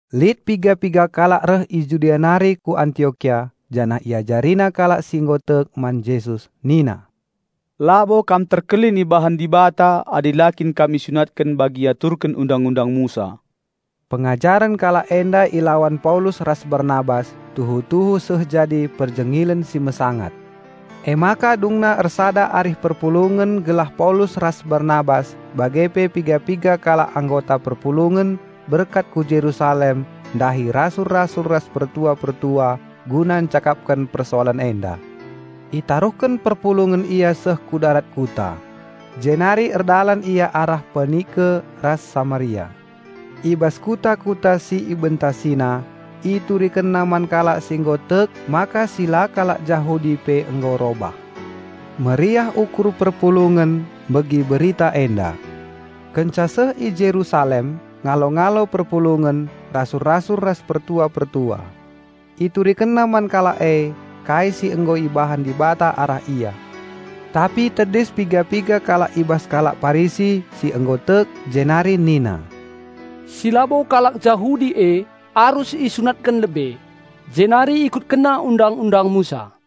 Lit piga-piga kalak reh i Judea nari ku Antiokia janah iajarina kalak si nggo tek man Jesus nina, "Labo kam terkelin ibahan Dibata adi la kin kam isunatken bagi iaturken Undang-undang Musa." Pengajaren kalak enda ilawan Paulus ras Barnabas tuhu-tuhu seh jadi perjengilen si mesangat. Emaka dungna ersada arih perpulungen gelah Paulus ras Barnabas bage pe piga-piga kalak anggota perpulungen berkat ku Jerusalem ndahi rasul-rasul ras pertua-pertua guna ncakapken persoalen enda. Itaruhken perpulungen ia seh ku darat kuta. Jenari erdalan ia arah Penike ras Samaria. I bas kuta-kuta si ibentasina, iturikenna man kalak si nggo tek maka si la kalak Jahudi pe nggo robah. Meriah ukur perpulungen megi berita enda. Kenca seh i Jerusalem, ngalo-alo perpulungen, rasul-rasul ras pertua-pertua. Iturikenna man kalak e kai si nggo ibahan Dibata arah ia. Tapi tedis piga-piga kalak i bas kalak Parisi si nggo tek jenari nina, "Si labo kalak Jahudi e arus isunatken lebe, jenari ikutkenna Undang-undang Musa."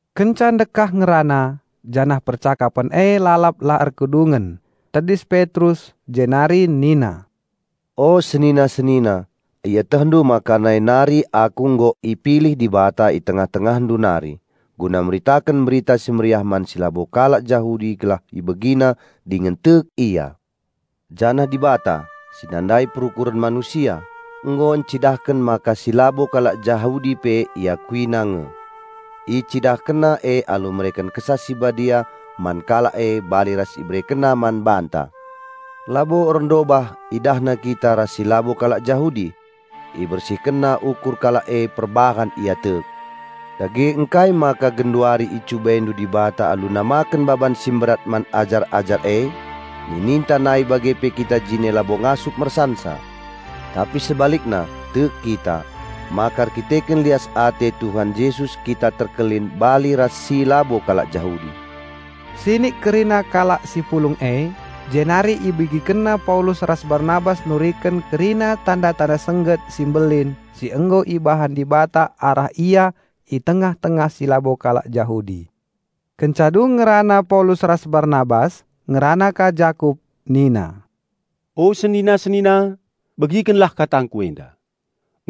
Kenca ndekah ngerana, janah percakapen e lalap la erkedungen, tedis Petrus, jenari nina, "O senina-senina, ietehndu maka nai nari aku nggo ipilih Dibata i tengah-tengahndu nari guna meritaken Berita Si Mehuli man si labo kalak Jahudi gelah ibegina dingen tek ia. Janah Dibata, si nandai perukuren manusia, nggo encidahken maka si labo kalak Jahudi pe IakuiNa nge. IcidahkenNa e alu mereken Kesah Si Badia man kalak e bali ras IberekenNa man banta. Labo erndobah IdahNa kita ras si labo kalak Jahudi. IbersihkenNa ukur kalak e perbahan ia tek. Dage ngkai maka genduari icubaindu Dibata alu namaken baban si mberat man ajar-ajar e? Nininta nai bage pe kita jine labo ngasup mersansa. Tapi sebalikna, tek kita, maka erdandanken lias ate Tuhan Jesus kita terkelin bali ras si labo kalak Jahudi." Sinik kerina kalak si pulung e. Jenari ibegikenna Paulus ras Barnabas nuriken kerina tanda-tanda sengget si mbelin si nggo ibahan Dibata arah ia i tengah-tengah si labo kalak Jahudi. Kenca dung ngerana Paulus ras Barnabas, ngerana ka Jakup, nina, "O senina-senina, begikenlah katangku enda!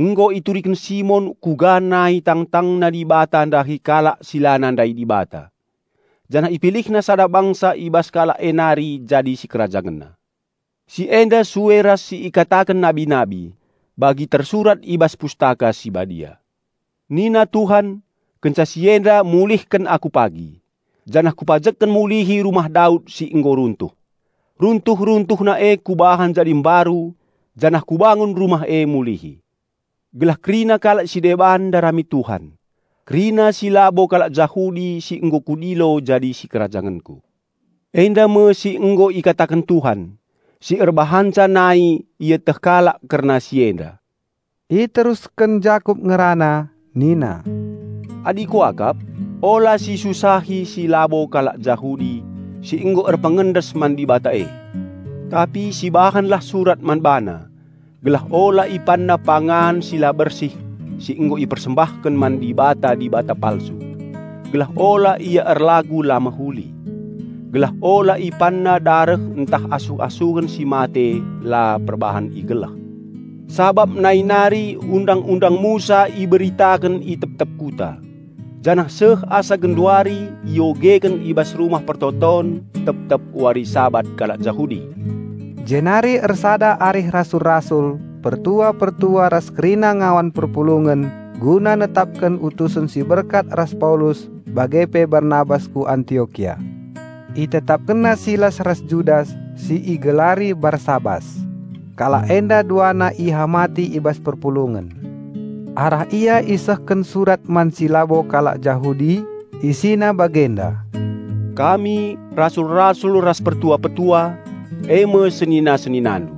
Nggo ituriken Simon kuga nai tangtangna Dibata ndahi kalak si la nandai Dibata janah IpilihNa sada bangsa i bas kalak e nari jadi si KerajangenNa. Si enda sue ras si ikataken nabi-nabi bagi tersurat i bas Pustaka Si Badia, 'Nina Tuhan: Kenca si enda mulihken Aku pagi; janah Kupajekken mulihi rumah Daud si nggo runtuh. Runtuh-runtuhna e Kubahan jadi mbaru janah Kubangun rumah e mulihi. Gelah kerina kalak si deban ndarami Tuhan, kerina si labo kalak Jahudi si nggo Kudilo jadi si kerajangenKu. Enda me si nggo ikataken Tuhan, si erbahanca nai ieteh kalak kerna si enda.'" Iterusken Jakup ngerana nina, "Adi kuakap, ula sisusahi si labo kalak Jahudi si nggo erpengendes man Dibata e. Tapi sibahanlah surat man bana gelah ula ipanna pangan si la bersih si nggo ipersembahken man dibata-dibata palsu; gelah ula ia erlagu la mehuli; gelah ula ipanna dareh ntah asuh-asuhen si mate la perbahan igeleh. Sabap nai nari Undang-undang Musa iberitaken i tep-tep kuta, janah seh asa genduari iogeken i bas rumah persembahen tep-tep wari Sabat kalak Jahudi." Jenari ersada arih rasul-rasul, pertua-pertua ras kerina ngawan perpulungen guna netapken utusen si berkat ras Paulus bage pe Barnabas ku Antiokia. Itetapkenna Silas ras Judas si igelari Barsabas. Kalak enda duana ihamati i bas perpulungen. Arah ia isehken surat man si labo kalak Jahudi; isina bagenda, "Kami, rasul-rasul ras pertua-pertua, eme senina-seninandu,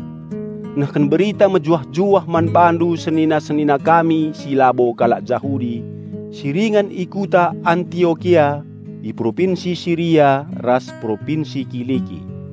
nehken berita mejuah-juah man bandu senina-senina kami si labo kalak Jahudi si ringan i kuta Antiokia, i Propinsi Siria ras Propinsi Kiliki.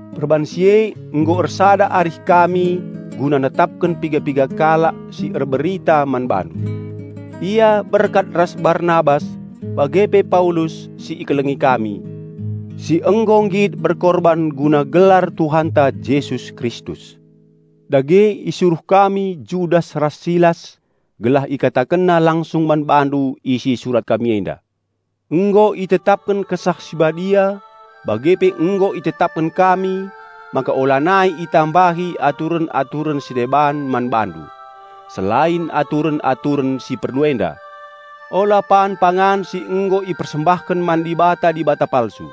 Perbahan si e nggo ersada arih kami guna netapken piga-piga kalak si erberita man bandu. Ia berkat ras Barnabas bage pe Paulus, si ikelengi kami, si nggo nggit berkorban guna gelar Tuhanta Jesus Kristus. Dage isuruh kami Judas ras Silas gelah ikatakenna langsung man bandu isi surat kami enda. Nggo itetapken Kesah Si Badia bage pe nggo itetapken kami maka ulanai itambahi aturen-aturen si deban man bandu, selain aturen-aturen si perlu enda; ula pan pangan si nggo ipersembahken man dibata-dibata palsu;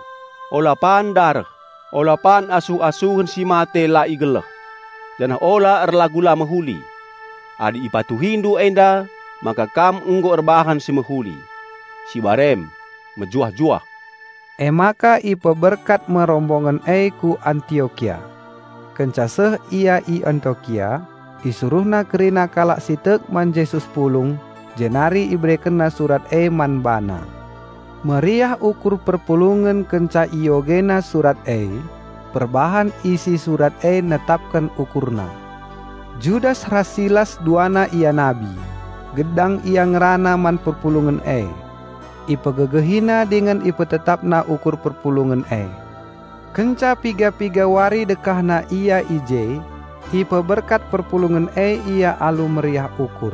ula pan dareh; ula pan asuh-asuhen si mate la igeleh; janah ula erlagu la mehuli. Adi ipatuhindu enda maka kam nggo erbahan si mehuli. Sibar em. Mejuah-juah." Emaka ipeberkat me rombongen e ku Antiokia. Kenca seh ia i Antiokia, isuruhna kerina kalak si tek man Jesus pulung, jenari iberekenna surat e man bana. Meriah ukur perpulungen kenca iogena surat e, perbahan isi surat e netapken ukurna. Judas ras Silas duana ia nabi; gedang ia ngerana man perpulungen e. Ipegegehina dingen ipetetapna ukur perpulungen e. Kenca piga-piga wari dekahna ia i je, ipeberkat perpulungen e ia alu meriah ukur.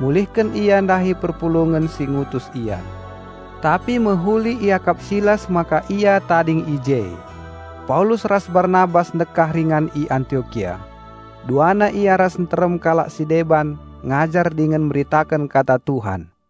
Mulihken ia ndahi perpulungen si ngutus ia. (Tapi mehuli iakap Silas maka ia tading i je.) Paulus ras Barnabas ndekah ringan i Antiokia. Duana ia ras nterem kalak si deban ngajar dingen meritaken Kata Tuhan.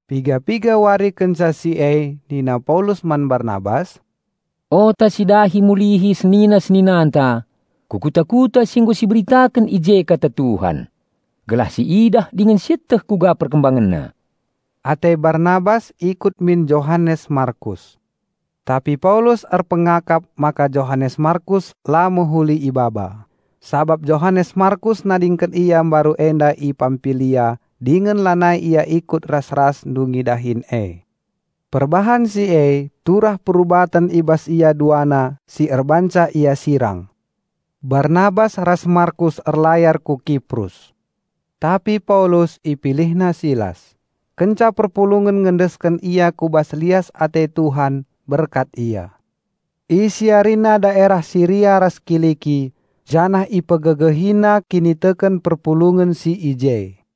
Piga-piga wari kenca si e nina Paulus man Barnabas, "Ota sidahi mulihi senina-seninanta ku kuta-kuta si nggo siberitaken i je Kata Tuhan. Gelah si idah dingen sieteh kuga perkembangenna." Ate Barnabas ikut min Johanes Markus. Tapi Paulus erpengakap maka Johanes Markus la mehuli ibaba, sabap Johanes Markus nadingken ia mbaru enda i Pampilia dingen lanai ia ikut ras-ras ndungi dahin e. Perbahan si e turah perubaten i bas ia duana si erbahanca ia sirang. Barnabas ras Markus erlayar ku Kiprus. Tapi Paulus, ipilihna Silas. Kenca perpulungen ngendesken ia ku bas lias ate Tuhan berkat ia. Isiarina daerah Siria ras Kiliki janah ipegegehina kiniteken perpulungen si i je.